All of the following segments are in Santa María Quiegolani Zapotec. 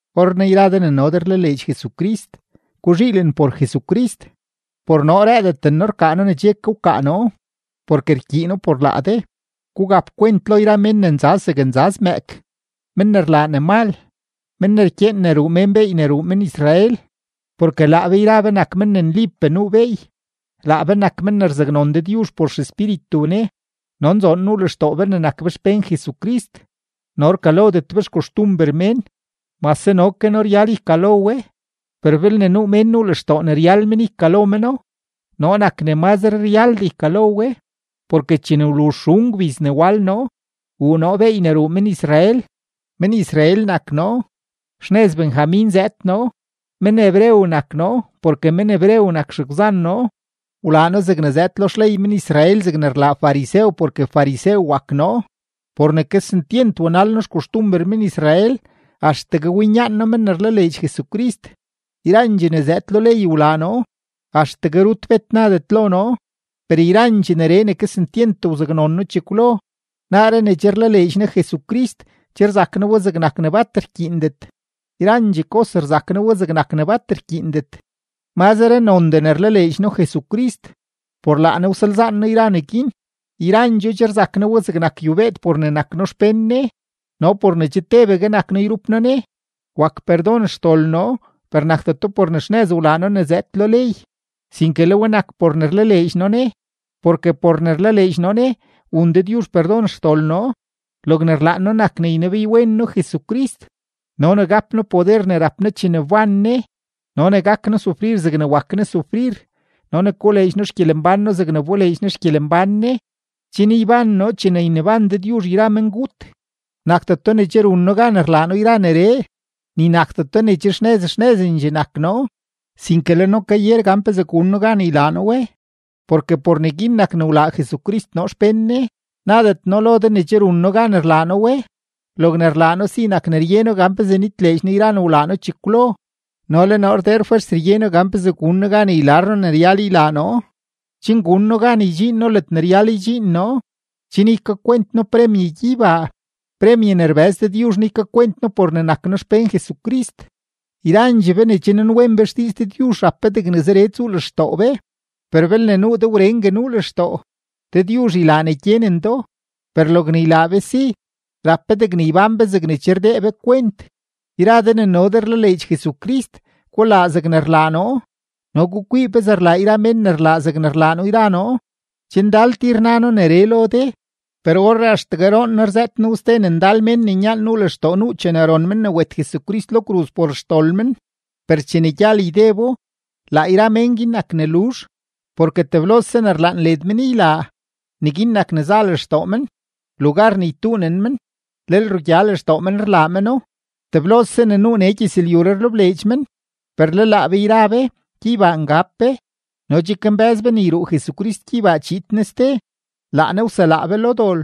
Orrenaa yra de ne no de rlaleedx Jesucrist, guzhiilen por Jesucrist. Por noo rëëdendet noo rkaa noo ne che ke wkaa noo, porke rkyiino por laa de. Gugap kwent lo yra mén ne nzaz zeg nzaz mëëk, men ne rlaa ne mal, men ne rkyeen ne ruu mén beey ne ruu men-Israel. Porke laa be yra be nak men ne nlipee nuu beey, laa be nak men ne rzaknon Dëdyuzh por XEspíritu Ne no nzoon nuu lextoo be ne nak be xpén Jesucrist no rkalodet be xkoxtumber mén. Mase no ke noo ryal ykalo we. Per belne nuu mén nuu lextoo ne ryal men ykalo meno, noo nak ne mazre ryaldee ykalo we. Porke chene wluzh xun gbiz ne wal noo, wuu noo beey ne ruu men-Israel; men-Israel nak noo; xnëz Benjamin zëëd noo; men-hebreo nak noo porke men-hebreo nak xegwzan noo; wlaa noo zegne zëëd lo xley men-Israel zegne rlaa farisew porke farisew wak noo. Por ne kesentyent wanal noo xkoxtumber men-Israel, axtegue winyaan noo men ne rlaleedx Jesucrist. Yrandxee ne zëëd lo ley wlaa noo; axtegue rut bet nadet lo noo. Per yrandxee neree ne kesentyent wsaknon noo chekwlo, naaree ne che rlaleedx noo Jesucrist, che rzak noo we zegnak ne bat rkyiindet. Yrandxee kos rzak noo we zegnak ne bat rkyiindet; mazre nondee ne rlaleedx noo Jesucrist. Por laa Ne wsalzaan noo yra neguin, yrandxoo che rzak noo we zegnak yubeed, por ne nak noo xpén Ne no por ne che tebegue nak noo yrup noo Ne. Wak perdon xdol noo, per nakdeto por ne xnëz wlaa noo ne zëëd lo ley, sinke le we nak por ne rlaleedx noo Ne, porke por ne rlaleedx noo Ne, wun Dëdyuzh perdon xdol noo. Logne rlaan noo nak ne ynebeywen noo Jesucrist no ne gap noo poder ne rap Ne chene wban Ne no ne gak noo sufrir zegne wak Ne sufrir no ne koleedx noo xgyelembán noo zegne wboleedx Ne xgyelembán Ne, chen yban noo chene yneban Dëdyuzh yra mengut. Nakdeto ne che run noo gan rlaa noo yra neree, ni nakdeto ne che xnëz xnëzendxee nak noo; sinke le noo kayer gan pezee gun noo gan ylaa noo we, porke por neguin nak ne wlaa Jesucrist noo xpén Ne. Nadet noo lo de ne che run noo gan rlaa noo we. Logne rlaa noo si nak ne rye noo gan pezee nitleedx noo yra ne wlaa noo chekwlo no le noo rdeer fwers rye noo gan pezee gun noo gan ylar noo ne ryal ylaa noo, chen gun noo gan ydxiin noo ledne ryal ydxiin noo, chen ykakwent noo premye gyeybaa, premye ne rbëz Dëdyuzh noo ykakwent noo por ne nak noo xpén Jesucrist. Yrandxee be ne che nanwen be xdiiz Dëdyuzh rap be degne zeree tsuu lextoo be; per belne nuu de wrengue nuu lextoo, Dëdyuzh ylaa ne gyenen do. Per logne ylaa be si, rap be degne ybán be zegne che rdee be kwent. Yra de ne no de rlaleedx Jesucrist, gulaa zegne rlaa noo no gukwii pezee rlaa yra mén ne rlaa zegne rlaa noo yra noo. Che ndal tir na noo neree lo de, per orree axtegue roon noo rzëët noo we ste ne ndal mén ne nyaan nuu lextoo nuu chene ron men ne wet Jesucrist lo kruz por xdol men. Per chene gyal ydebo, laa yra men guin nak ne luzh, porke teblose ne rlaan led men ylaa, neguin nak ne za lextoo men; lugar ne ytuunen men, lel rugya lextoo men ne rlaa meno; teblose ne nuu nee gyëzlyuree rlebleedx men. Per le laa be yra be, gyeybaa ngab be no che kambë́z be ne yruu Jesucrist gyeybaa chiid Ne ste, laa Ne wselaa be lo dol.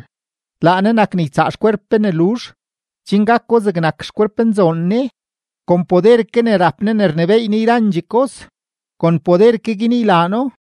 Laa Ne nak ne ytsaa xkwerp be ne luzh, chen gako zegnak xkwerpnzoon Ne; kon poder ke ne rap Ne ne rnebééy Ne yrandxee kos, kon poder ke guin ylaa No.